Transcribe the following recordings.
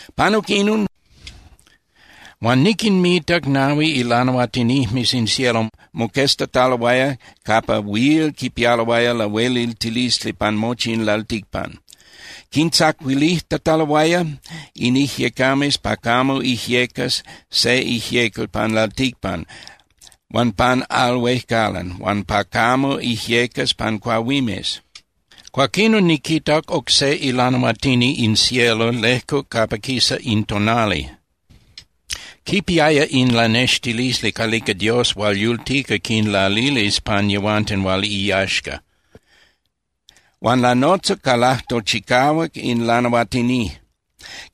Panuc inon, huan niquinmitac nahui ilanahuatinijmes in cielo moqueztataloaya capa huil quipialoaya lahueliltilisli pan mochi in lalticpan. Quintzacuilijtataloaya in ijyecames pa camo ijyecas se ijyecal pan lalticpan huan pan al huejcalan huan pa camo ijyecas pan cuahuimes. Cuaquinon niquitac oc se ilanahuatini in cielo lejcuc capa quisa in tonali. Quipiaya in lanextilisli calica Dios hual yultica quinlalilis pan yehuanten hual iyaxca. Huan lanotzac ca lajtol chicahuac in lanahuatini.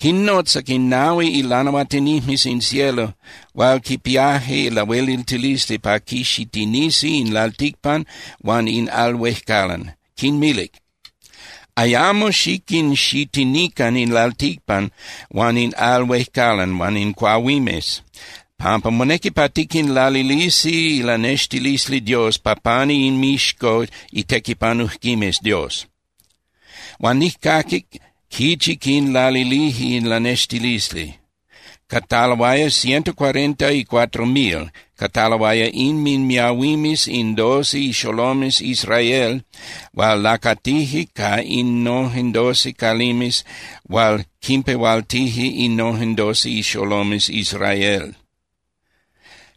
Quinnotzac in nahui ilanahuatinijmes in cielo hual quipiaje lahueliltilisli pa quixitinisi in lalticpan huan in al huejcalan, quinmilic: —Ayamo xiquinxitinican in lalticpan huan in al huejcalan huan in cuahuimes pampa monequi pa tiquinlalilisi ilanextilisli Dios pa pani inmixco itequipanujquimes Dios. Huan nijcaquic quichi quinlalilije in lanextilisli. Cataloaya ciento cuarenta y cuatro mil, cataloaya inminmiahuimes in doce ixolomes Israel hual lacatije ca innojen doce calimes hual quinpehualtije innojen doce ixolomes Israel.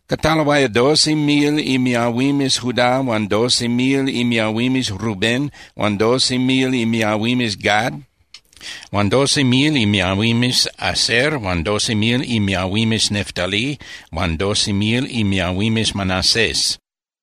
Cataloaya doce mil imiahuimes Judá huan doce mil imiahuimes Rubén huan doce mil imiahuimes Gad, huan doce mil imiahuimes Aser huan doce mil imiahuimes Neftalí huan doce mil imiahuimes Manases,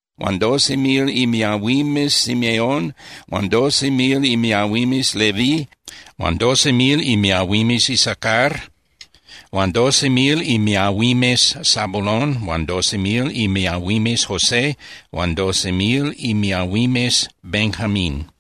huan doce mil imiahuimes Simeón huan doce mil imiahuimes Leví huan doce mil imiahuimes Isacar, huan doce mil imiahuimes Zabulón huan doce mil imiahuimes José huan doce mil imiahuimes Benjamín.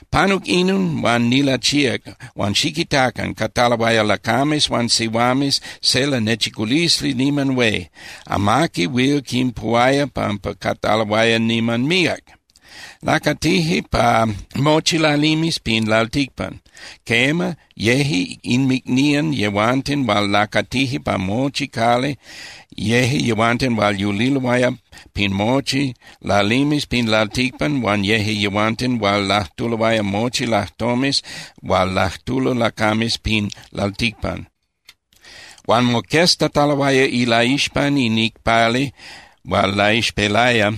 Panuc inon, huan nilachíac huan ¡xiquitacan! Cataloaya lacames huan sihuames, se lanechiculisli niman hué. Amaqui huil quinpuhuaya pampa cataloaya niman míac. Lacatije pa mochi lalimes pin lalticpan. Quema, yeje inmicnían yehuanten hual lacatije pa mochi cali, yeje yehuanten hual yuliloaya pin mochi lalimes pin lalticpan huan yeje yehuanten hual lajtuloaya mochi lajtomes hual lajtulo lacames pin lalticpan. Huan moqueztataloaya ilaixpan in icpali hual laixpelaya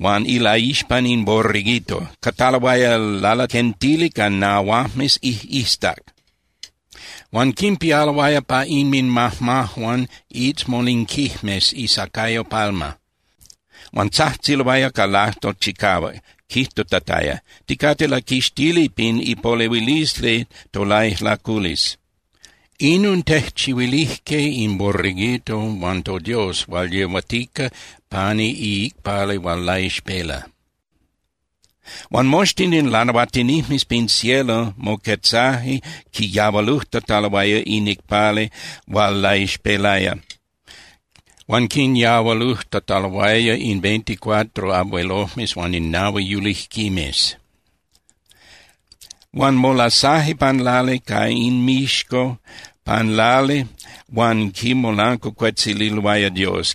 huan ilaixpan in Borreguito. Cataloaya lalaquentili ca nahuajmes ijꞌiztac, huan quinpialoaya pa inminmajmajuan iitzmolinquijmes isacayo palma. Huan tzajtziloaya ca lajtol chicahuac, quijtutataya: ¡Ticate laquixtili pin ipolehuilisli tolaijlaculisli! Inon tejchihuilijque in Borreguito huan toDios hual yehuatica pani iicpali hual laixpela. Huan moxtin in lanahuatinijmes pin cielo moquetzaje quiyahualujtataloaya in icpali hual laixpelaya huan quinyahualujtataloaya in veinticuatro abuelojmes huan in nahui yulijquimes. Huan molasaje pan lali ca inmixco pan lali huan quimolancuacuetzililoaya Dios.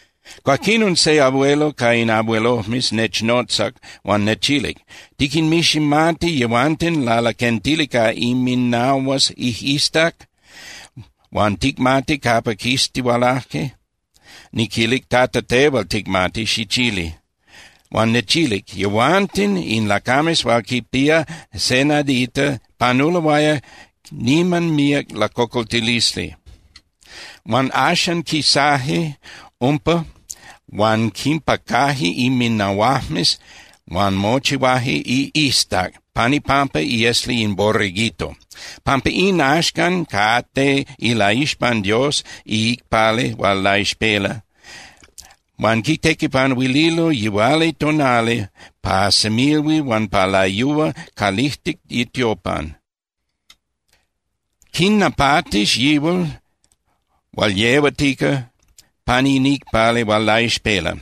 Cuaquinon se abuelo ca in abuelojmes nechnotzac huan nechilic: —¿Tiquinmiximati yehuanten lalaquentili ca inminahuajmes ijꞌiztac, huan ticmati capa quistihualaje? Niquilic: —Tata, tehual ticmati, xichili. Huan nechilic: —Yehuanten in lacames hual quipía se nadita panuloaya niman míac lacocoltilisli. Huan axan quisaje umpa huan quinpacaje inminahuajmes huan mochihuaje ijꞌiztac pan ipampa iesli in Borreguito. Pampa in, axcan cate ilaixpan Dios iicpali hual laixpela, huan quitequipanuililo yihualitonali pa semilhuil huan pa layúa calijtic itiopan. Quinnapatis yihual hual yehuatica pani in icpali hual laixpela,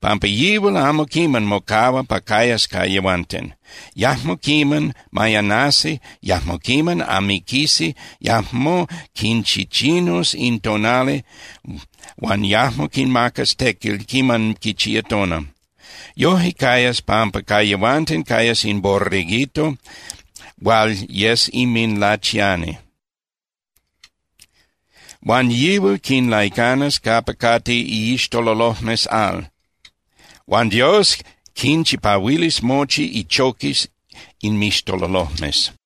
pampa yihual amo quiman mocahuas pa cayas ca yehuanten. Yajmo quiman mayanasi, yajmo quiman amiquisi, yajmo quinchichinus in tonali, huan yajmo quinmacas tequil quiman quichía tona. Yoje cayas pampa ca yehuanten cayas in Borreguito hual yes inminlachiani. Huan yihual quinlaicanas capa cate iixtololojmes al. Huan Dios quinchipahuilis mochi ichoquis inmixtololojmes.